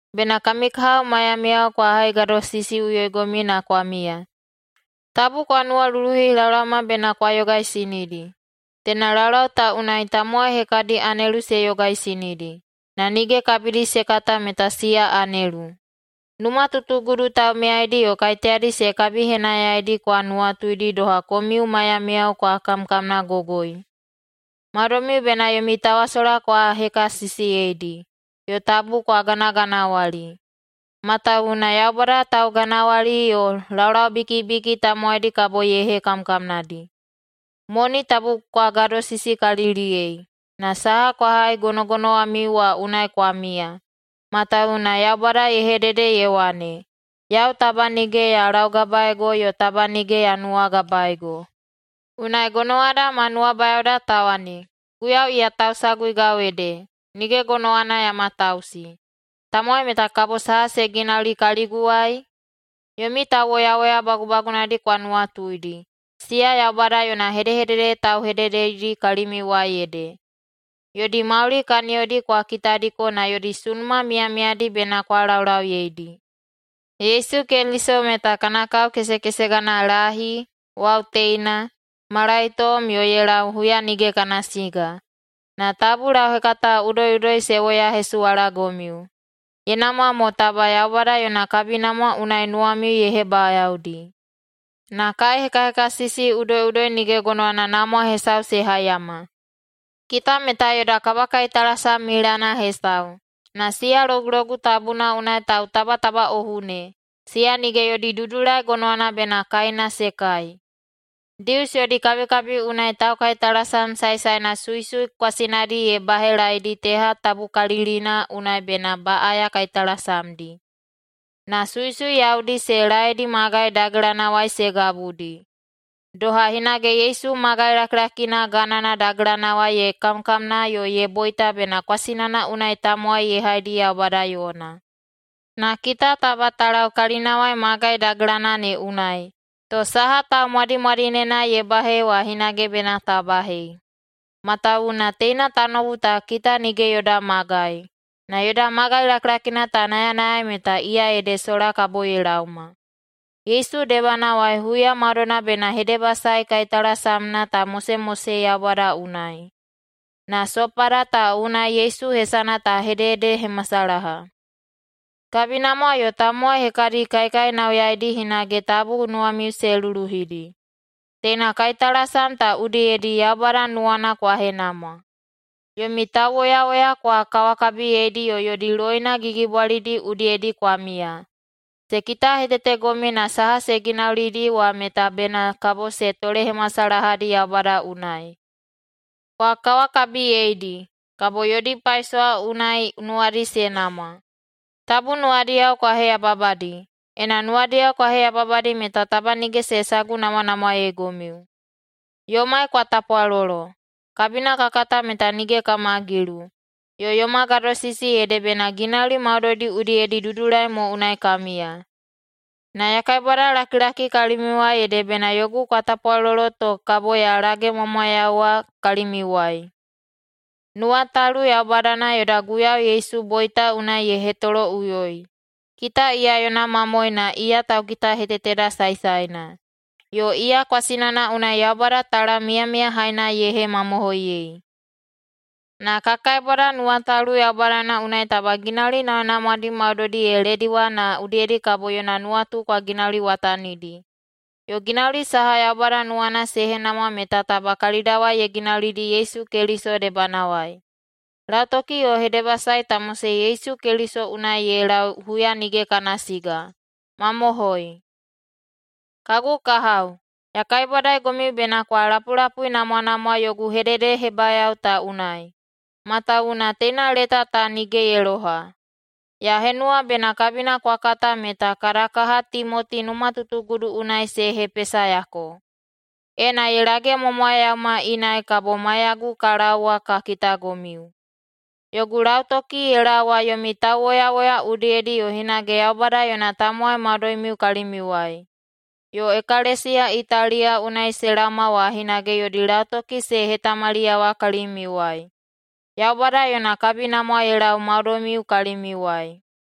Bena kami kahao maiyamiyao kwa haigadosisiꞌuyoigomiu na kwa miya. Tabu kwa nuwaluluhi laolaoma bena kwa yogaisinidi. Teina laulau ta unai tamowai hekadi anelu se yogaisinidi, na nige kabidi se kata meta siya anelu. Numatutugudu taumiyaidi yo kaiteyadi se kabihenayaidi kwa nuwatuidi doha komiu maiyamiyao kwa kamkamnagogoi. Maudoimiu bena yomi tawasola kwa hekasisiyeidi, yo tabu kwa ganaganawali. Matawuwuna Yaubada tauganawali yo laulaubikibiki tamowaidi kabo ye hekamkamnadi. Moni tabu kwa gadosisikaliliyei, na saha kwa hai gonogonowamiu wa unai kwa miya, matawuwuna Yaubada ye hedede ye wane, “Yau taba nige ya laugabaego yo taba nige ya nuwagabaego.” Unai gonowada ma nuwabayaoda ta wane, “Guiyau iya tausaguigau ede. Nige gonowana ya matausi. Tamowai meta kabo saha se ginauli kaliguwai?” Yomi tauwoyawoya bagubagunadi kwa nuwatuidi. Siya Yaubada yona hedehedede tauhedededi kalimiuwai ede. Yodi mauli kaniyodi kwa kitadiko na yodi sunuma miyamiyadi bena kwa laulauyedi. Yesu Keliso meta kana kao kesekesegana, lahi, wau teina, malaitom yo ye lau huya nige kana siga. Na tabu lauhekata udoiꞌudoi se woyahesuwalagomiu. Ye namwa mo taba Yaubada yona kabinamwa unai nuwamiu ye hebayaodi. Na kaihekahekasisi udoiꞌudoi nige gonowana namwa hesau se haiyama. Kita meta yoda kabakaitalasam milana hesau, na siya Logulogu Tabuna unai tautabatabaꞌohu ne, siya nige yodi dudulai gonowana bena kaina se kai. Dius yodi kabikabi unai taukaitalasam saesaena suisui kwasinadi ye bahelaedi teha tabukalikalilina unai bena baꞌaya kaitalasamdi, na suisui yaudi se laedi magai dagelanawai se gabudi. Doha hinage Yesu magai lakilakina ganana dagelanawai ye kamkamna yo ye boita bena kwasinana unai tamowai ye haidi Yaubada yona. Na kita taba ta lau kalinawai magai dagelana ne unai, to saha taumwadimwadinena ye bahei wa hinage bena ta bahei. Matawuwuna teina tanoubu ta kita nige yoda magai, na yoda magai lakilakina ta nayanayai meta iya ede sola kabo ye laoma. Yesu debanawai huya maudoina bena hedebasae kaitalasamna ta mosemosei Yaubada unai, na sopada ta unai Yesu hesana ta hededehemasalaha. Kabinamwa yo tamowai hekadi kaikainauyaidi hinage tabu nuwamiu se luluhidi. Teina kaitalasam ta udiyedi Yaubada nuwana kwa henamwa. Yomi tauwoyawoya kwa kawakabiyeidi yo yodi loina gigibwalidi udiyedi kwa miya. Se kitahetetegomiu na saha se ginaulidi wa meta bena kabo se tolehemasalahadi Yaubada unai. Kwa kawakabiyeidi, kabo yodi paisowa unai nuwadi se namwa. Tabu nuwadiyao kwa heyababadi. Ena nuwadiyao kwa heyababadi meta taba nige se sagunamwanamwaeigomiu. Yomai kwa tapwalolo. Kabina ka kata meta nige kama gilu, yo yoma gadosisi ede bena ginauli maudoidi udiyedi dudulai mo unai ka miya. Na ya kaibwadalakilaki kalimiuwai ede bena yogu kwa tapwalolo to kabo ya lagemwamwayauwa kalimiuwai. Nuwatalu Yaubadana yoda Guiyau Yesu boita unai ye hetoloꞌuyoi. Kita iya yona mamoe na iya taukitaheteteda saesaena, yo iya kwasinana unai Yaubada talam miyamiyahaina ye hemamohoiyei. Na ka kaibwada Nuwatalu Yaubadana unai taba ginauli namwanamwadi maudoidi ye lediwa na udiyedi kabo yona nuwatu kwa ginauliwatanidi. Yo ginauli saha Yaubada nuwana se henamwa meta taba kalidawai ye ginaulidi Yesu Keliso debanawai. Lautoki yo hedebasae ta mosei Yesu Keliso unai ye lau huya nige kana siga. Mamohoi! Kagu kahao, ya kaibwadaigomiu bena kwa lapulapuinamwanamwa yogu hededehebayao ta unai, matawuwuna teina leta ta nige ye loha. Ya henuwa bena kabina kwa kata meta kada kaha Timoti numatutugudu unai se hepesayako. Ena ye lagemwamwayauma inai kabo maiyagu ka laowa ka kitagomiu. Yogu lautoki ye laowa yomi tauwoyawoya udiyedi yo hinage Yaubada yona tamowai maudoimiu kalimiuwai. Yo ekalesiya Italiya unai se laoma wa hinage yodi lautoki se hetamaliyawa kalimiuwai. Yaubada yona kabinamwa ye laowa maudoimiu kalimiuwai.